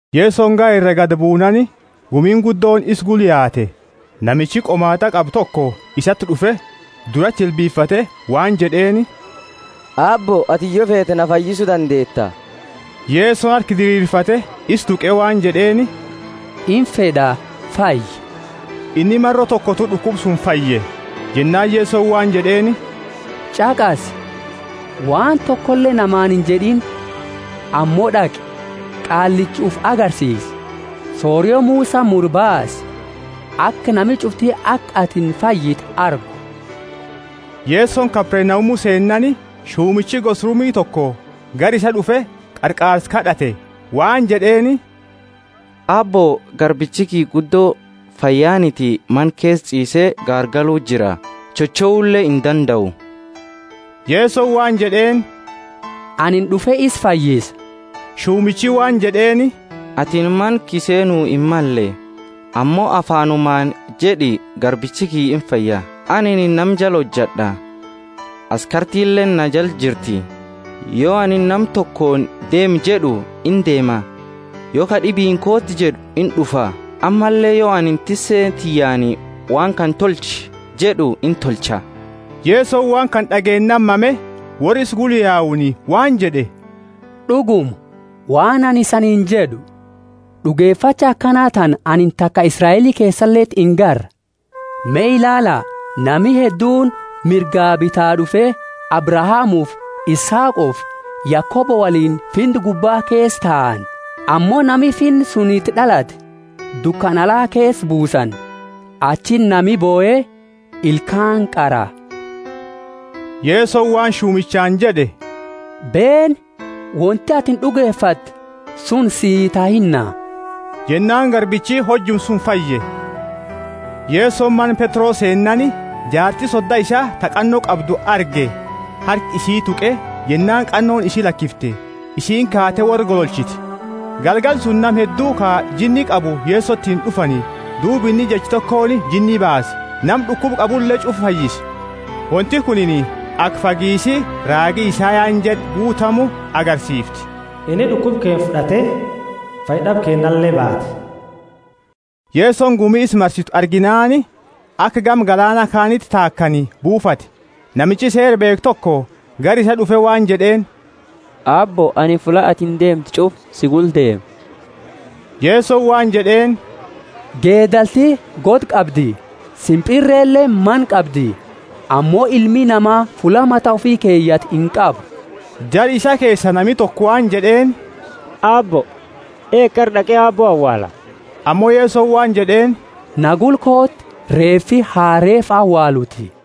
Yesoni gaara iraa gadi buunaani, gumiini guddooni isa gula yaate. Namichi qomaat'a qabu toko isati d'ufe, durati jilbifate waan jed'eeni, Aabbo, atini yo feete na fayyisu dandeeta. Yesoni harka diriirfate, isa tuqe waan jed'eeni, Imfed'a, fayyi. Inni maro tokotu d'ukuba suni fayye. Jennaani Yesoni waan jed'eeni, Ch'aqasi! Waan tokole namaani injed'ini, ammo d'aqi, qaallicha ufi agarsiisi, sorio Musani mure baasi, aka nami ch'ufti aka atini fayyite argu. Yesoni Kapernaumu seennaani, shumichi gosa Rumi toko gara isaa d'ufe, qarqaarsa kad'ate. Waan jed'eeni, Aabbo garbichi kiyya guddo fayyaniti mana keesa ch'iisee garagalu jira, chochoule indandau. Yesoni waan jed'eeni, Anini d'ufe isa fayyisa. Shumichi waan jed'eeni, Atini mana kiyya seenu himmalle, ammo afaanumaani jed'i, garbichi kiyya imfaya. Anini nama jala hojad'a, askartileeni na jala jirti; yo anini nama tokooni. Deemi jed'u, indeema; yo ka d'ibiini, Kooti jed'u, ind'ufa. Ammalle yo anini tisse tiyyaani, Waan kana tolchi jed'u, intolcha. Yesoni waan kana d'ageennaani mame, worra isa gula yauni waan jed'e, D'uguma, waan anini isaniini jed'u, d'ugefacha akana tana anini taka Israeli keesaleti ingarre. Me ilaala, nami hedduuni mirga bitaa d'ufe Abrahamufi Isaaqofi Yakobo woliini Finna gubba keesa taani. Ammo nami Finna suni iti d'alate dukana ala keesa buusani, achiti nami bohe ilkaani qara. Yesoni waan shumichaani jed'e, Beeni, wonti atini d'ugefatte suni sii tahinna. Jennaani garbichi hojuma suni fayye. Yesoni mana Petro seennaani, jaarti soda isaa ta qanno qabdu arge. Harka isii tuqe, jennaani qannooni isi lakifte, isiini kaate worra gololchite. Galgala suni nama heddu ka jinni qabu Yesotiini d'ufani duuba inni jecha tokooni jinni baase, nama d'ukuba qabule ch'ufa fayyise. Wonti kunini aka fagiisi raagi Isayani jed'e guutamu agarsiifti: Inni d'ukuba keenna fud'ate, fayyad'aba keennale baate. Yesoni gumi isa marsitu arginaani aka gama galaana kaaniti taakani buufate. Namichi Seera beekhu toko gara isaa d'ufe waan jed'eeni, Aabbo, anini fulla atini deemtu ch'ufa si gula deema. Yeso waan jed'eeni, Geedalti goda qabdi, simpirreleeni mana qabdi, ammo Ilmi Nama fulla mata ufi keyatu inqabu. Jara isaa keesaa nami toko waan jed'eeni, Aabbo, eegi, qara d'aqe Aabbo awaala. Ammo Yesoni waan jed'eeni, Na gula kooti, reefi ha reefa awaaluti.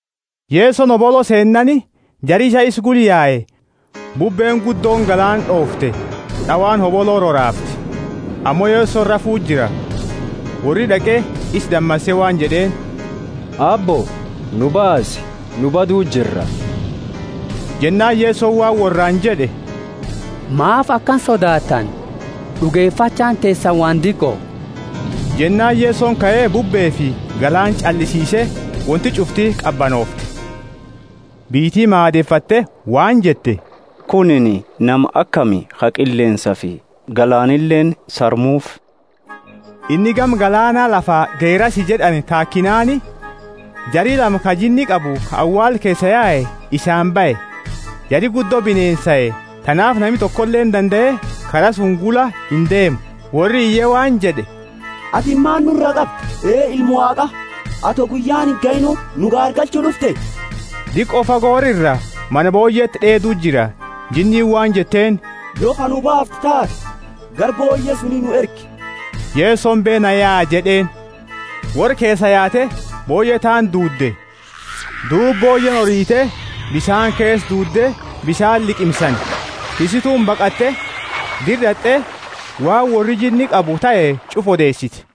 Yesoni hobolo seennaani, jari isaa isa gula yae. Bubbeeni guddooni galaana d'oofte, d'awaani hobolo roraafte, ammo Yesoni rafu jira. Worri d'aqe isa damase waan jed'eeni, Aabbo, nu baasi, nu badu jirra. Jennaani Yesoni waan worraani jed'e, Maafi akana sodaattani? D'ugefachaani teesani waan diqo. Jennaani Yesoni kae, bubbeefi galaana ch'allisiise, wonti ch'ufti qabanoofte. Biyyiti maadefatte waan jette, Kunini nama akami, ka qilleensafi galaanileeni sarmuufi? Inni gama galaana, lafa Gerasi jed'ani taakinaani, jari lama ka jinni qabu ka awaala keesaa yae isaani bahe. Jari guddo bineensae, tanaafi nami tokoleeni dandae kara suni gula indeemu. Worri iye waan jed'e, Atini maani nuraa qabda, Ee Ilma Waaqa? Ato guyyaani ingahiini nu gaargalchu d'ufte? Diqo fago worra iraa mana booyyeti d'eedu jira. Jinniini waan jetteeni, Yo ka nu baaftu taate, gara booyye suni nu ergi. Yesoni beena Yaa jed'eeni. Worra keesaa yaate booyye taani duudde. Duuba booyyeeni orite, bisaani keesa duudde, bisaani liqimsani. Tissituuni baqatte, dira d'at'e waan worri jinni qabu tahe ch'ufa odeesite.